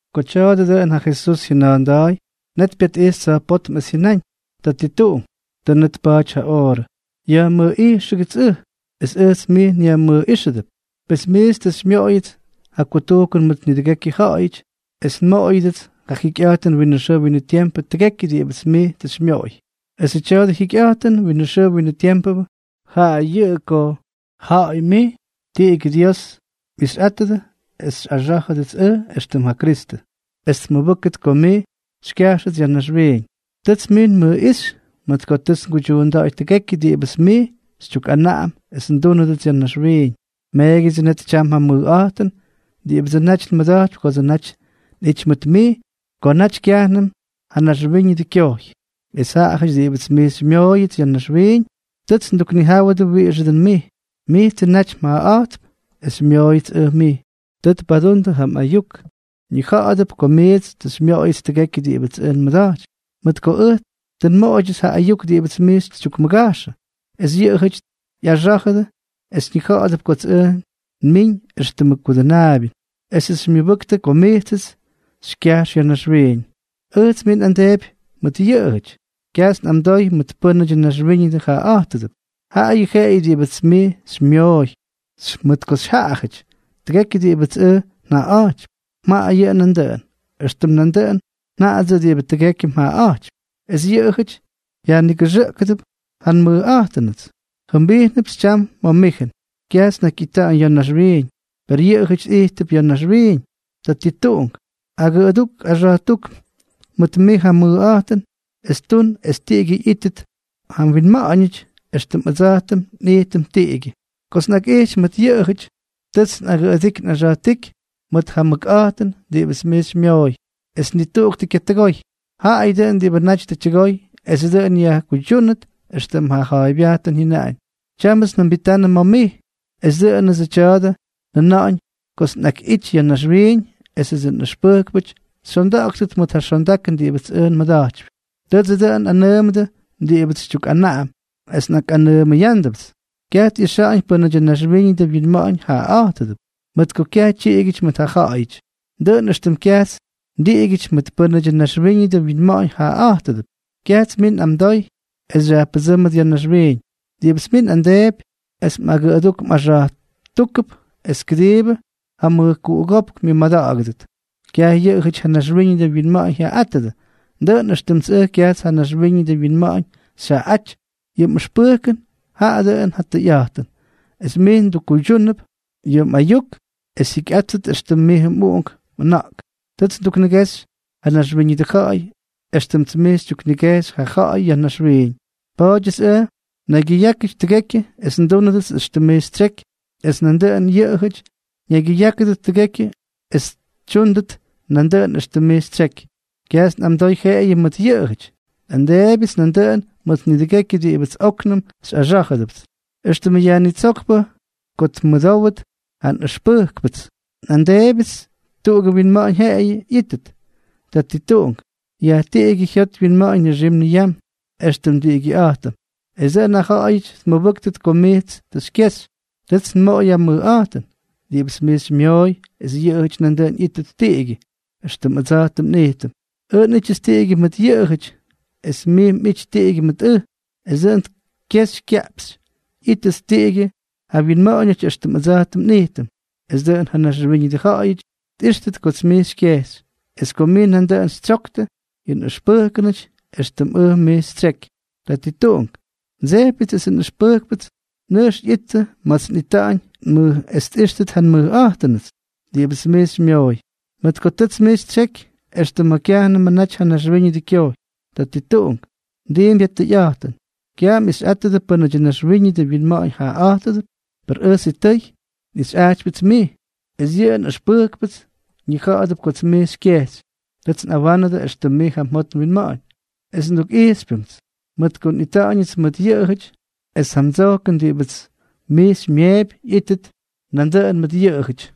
Ko tya̱a̱dʉ dʉꞌʉn ja Jesús jyʉna̱a̱nda̱a̱y, net pyatꞌijxy tsa̱jpótm es jyʉnáñ: —Tatituꞌunk, tʉ net tpa̱a̱ty ja oorʉ. Yajmʉjꞌijxʉgʉts ʉj, es ʉjts mij nyajmʉjꞌíxʉdʉp. Pes mijts tʉ xymyoꞌoyʉts ja kutujkʉn mʉt nidʉgekyʉ ja̱ꞌa̱yʉty es nmoꞌoyʉdʉts ja jikyꞌa̱jtʉn winʉ xʉʉ winʉ tiempʉ tʉgekyʉ diꞌibʉts mij tʉ xymyoꞌoy. Esʉ tya̱a̱dʉ jikyꞌa̱jtʉn winʉ xʉʉ winʉ tiempʉ, jaꞌa yʉꞌʉ ko ja̱ꞌa̱y mij, tiꞌigyʉ Dios, mꞌixyꞌátʉdʉ es xyꞌaxá̱jʉdʉts ʉj éxtʉm ja Kristʉ es tmʉbʉ́ktʉt ko mij xykyajxʉts ya̱ naxwiiñ. Tʉts mij nmʉjꞌíxy mʉt ko tʉts nguydyuunda̱ꞌa̱y tʉgekyʉ diꞌibʉts mij xytyukꞌanaꞌam es ndúnʉdʉts ya̱ naxwiiñ. Meegyʉdsʉ net tyam ja mʉjꞌa̱jtʉn diꞌibʉdsʉ naty nmʉda̱jtypy kodsʉ naty nꞌity mʉt mij ko naty kyajnʉm ja naxwíñʉdʉ kyojy. ’Es ja ja̱ꞌa̱yʉty diꞌibʉts mij xymyooyʉts ya̱ naxwiiñ, tʉts nduknijáwʉdʉ wiꞌixʉ dʉn mij. Mijtsʉ naty mjaꞌaꞌa̱jtʉp, es xymyooyʉts ʉj mij. Tʉ tpadundʉ ja mꞌayuk. Ñija̱ꞌa̱dʉp ko mijts tʉ xymyoꞌoyʉts tʉgekyʉ diꞌibʉts ʉj nmʉda̱jtypy, mʉt ko ʉj tʉ nmoꞌoydyʉts ja ayuk diꞌibʉts mij xytyukmʉgajxʉ, es yʉꞌʉjʉty ꞌyaxá̱jʉdʉ es ñija̱ꞌa̱dʉp kots ʉj nmiiñ éxtʉmʉ mGudʉnaabyʉ, esʉts xymyʉbʉktʉ ko mijtsʉts xykyajx ya̱ naxwiiñ. ’Ʉjts mij nꞌamdeepy mʉt yʉꞌʉjʉty. Kyajts nꞌamdoy mʉt pʉ́nʉdyʉ naxwíñʉdʉ jaꞌaꞌa̱jtʉdʉp, jaꞌayʉ jeꞌeyʉ diꞌibʉts mij xymyooy, mʉt ko xyjaꞌajʉty. Tʉgekyʉ diꞌibʉts ʉj njaꞌaꞌa̱jtypy, mjaꞌayʉ nandʉꞌʉn, éxtʉm nandʉꞌʉn njaꞌadsʉꞌʉ diꞌibʉ tʉgekyʉ mjaꞌaꞌa̱jtypy. Es yʉꞌʉjʉty yajnigʉxʉꞌkʉdʉp ja nmʉjꞌa̱jtʉnʉts. ’Jʉmbijnʉpts tyam ma̱ mijʉn. Kyajts nnakyꞌita̱ꞌa̱ñ ya̱ naxwiiñ, per yʉꞌʉjʉty ijttʉp ya̱ naxwiiñ. Tatituꞌunk, agʉduk axa̱jtúk mʉt mij ja mmʉkꞌa̱jtʉn es tun es tiꞌigyʉ ꞌyíttʉt ja wyinma̱ꞌa̱ñʉty, éxtʉm ʉdsa̱jtʉm nꞌijtʉm tiꞌigyʉ. Kots nꞌakꞌijty mʉt yʉꞌʉjʉty, tʉts nꞌagʉdiky nꞌaxa̱jtíky mʉt ja mʉkꞌa̱jtʉn diꞌibʉts mij xymyooy. Es ni tuꞌuk tʉ kyatʉgoy, jaꞌayʉ dʉꞌʉn diꞌibʉ naty tʉ tyʉgoy es dʉꞌʉn yajkuydyúnʉt éxtʉm ja mja̱a̱ybyajtʉn jyʉnaꞌañ. ’Tyámʉts njʉmbitanʉ ma̱ mij. Es dʉꞌʉnʉts yʉ tya̱a̱dʉ njʉna̱ꞌa̱ñ kots nꞌakꞌity ya̱ naxwiiñ esʉdsʉ nꞌʉxpʉjkpʉty xyonda̱ꞌa̱ktʉt mʉt ja xondakʉn diꞌibʉts ʉj nmʉda̱jtypy. Tʉdsʉ dʉꞌʉn nꞌanʉʉmʉdʉ diꞌibʉts xytyukꞌanaꞌam, es nꞌakꞌanʉʉmʉyándʉpts. Kyaj tꞌixa̱ꞌa̱ñ pʉ́nʉdyʉ naxwíñʉdʉ winma̱ꞌa̱ñ jaꞌaꞌa̱jtʉdʉp, mʉt ko kyaj tyiꞌigyʉty mʉt jaꞌajʉty, dʉꞌʉn éxtʉm kyajts ndiꞌigyʉty mʉt pʉ́nʉdyʉ naxwíñʉdʉ winma̱ꞌa̱ñ jaꞌaꞌa̱jtʉdʉp. Kyajts mij nꞌamdoy es xyajpʉdsʉ́mʉt ya̱ naxwiiñ. Diꞌibʉts mij nꞌamdeepy es mꞌagʉꞌʉdúk mꞌaxa̱jtúkʉp es kʉdiibʉ ja mʉjkuꞌugópk myʉmada̱ꞌa̱gʉdʉt. Kyaj yʉꞌʉjʉty ja naxwíñʉdʉ winma̱ꞌa̱ñ jyaꞌaꞌátʉdʉ, dʉꞌʉn éxtʉmts ʉj kyajts ja naxwíñʉdʉ winma̱ꞌa̱ñ xyjaꞌaꞌáty. Yʉ mꞌʉxpʉjkʉn jaꞌa dʉꞌʉn ja tʉyꞌa̱jtʉn. Es mij mdukkuydyúnʉp yʉ mꞌayuk es jyikyꞌáttʉt éxtʉm mijʉ mꞌuꞌunk mꞌʉna̱ꞌk. Tʉts nduknigexy ja naxwíñʉdʉ ja̱ꞌa̱y, éxtʉmts mij xytyuknigejxy ja ja̱ꞌa̱y ya̱ naxwiiñ. Pa̱a̱dyʉts ʉj nnaygyʉyákyʉty tʉgekyʉ es ndúnʉdʉts éxtʉm mij xytsyeky. Es nandʉꞌʉn yʉꞌʉjʉty ñaygyʉyákʉdʉt tʉgekyʉ es xytyúndʉt nandʉꞌʉn éxtʉm mij xytsyeky. ’Kyajts nꞌamdoy jeꞌeyʉ mʉt yʉꞌʉjʉty, nꞌamdeebyʉts nandʉꞌʉn mʉt nidʉgekyʉ diꞌibʉts óknʉm xyꞌaxá̱jʉdʉpts éxtʉmʉ Yajnitsókpʉ ko tmʉdówdʉt ja ꞌyʉxpʉjkʉnʉty ja nꞌʉxpʉjkpʉts. Nꞌamdeebyʉts es tuꞌugʉ wyinma̱ꞌa̱ñ jeꞌeyʉ ꞌyíttʉt. Tatituꞌunk, yajtiꞌigyʉdʉ jyot wyinma̱ꞌa̱ñ nixim niyam, éxtʉm ndiꞌigyʉꞌa̱jtʉm, es dʉꞌʉn ja ja̱ꞌa̱yʉty tʉmʉbʉ́ktʉt ko mijts tʉ xykyexy. Tʉts nmoꞌoy ja mʉjꞌa̱jtʉn diꞌibʉts mij xymyooy es yʉꞌʉjʉty nandʉꞌʉn ꞌyíttʉt tiꞌigyʉ, éxtʉm ʉdsa̱jtʉm nꞌijtʉm. Ʉj nꞌítyʉts tiꞌigyʉ mʉt yʉꞌʉjʉty, es mij mꞌity tiꞌigyʉ mʉt ʉj, es dʉꞌʉn kexy kaꞌpxy ꞌyíttʉt tiꞌigyʉ ja wyinma̱ꞌa̱ñʉty éxtʉm ʉdsa̱jtʉm nꞌijtʉm, es dʉꞌʉn ja naxwíñʉdʉ ja̱ꞌa̱yʉty tꞌíxtʉt kots mij xykyejxy, es ko mij nandʉꞌʉn xytsyoktʉ yʉ nꞌʉxpʉjkpʉty éxtʉmts ʉj mij xytsyeky. ’Tatituꞌunk, ndsejpyʉts esʉ nꞌʉxpʉjkpʉts nʉjx ꞌyittʉ ma̱ts ʉj nꞌita̱ꞌa̱ñ es tꞌíxtʉt ja nmʉjꞌa̱jtʉnʉts diꞌibʉts mij xymyooy, mʉt ko tʉts mij xytsyeky extʉ ma̱ kyajnʉmʉ naty ja naxwíñʉdʉ kyojy. Tatituꞌunk, mdiimpy ja tʉyꞌa̱jtʉn. Kyaj mꞌixyꞌátʉdʉ pʉ́nʉdyʉ naxwíñʉdʉ winma̱ꞌa̱ñ jaꞌaꞌa̱jtʉdʉp. Per ʉj sitʉy nꞌixyꞌajtypyʉts mij, es yʉ nꞌʉxpʉjkpʉts ñija̱ꞌa̱dʉp kots mij xykyejxy. Tʉts nꞌawánʉdʉ éxtʉm mij ja mjot mwinma̱ꞌa̱ñ, es ndukꞌijxypyñʉmts, mʉt ko nꞌita̱ꞌa̱ñʉts mʉt yʉꞌʉjʉty, es ja mdsojkʉn diꞌibʉts mij xymyeepy ꞌyítʉt nandʉꞌʉn mʉt yʉꞌʉjʉty.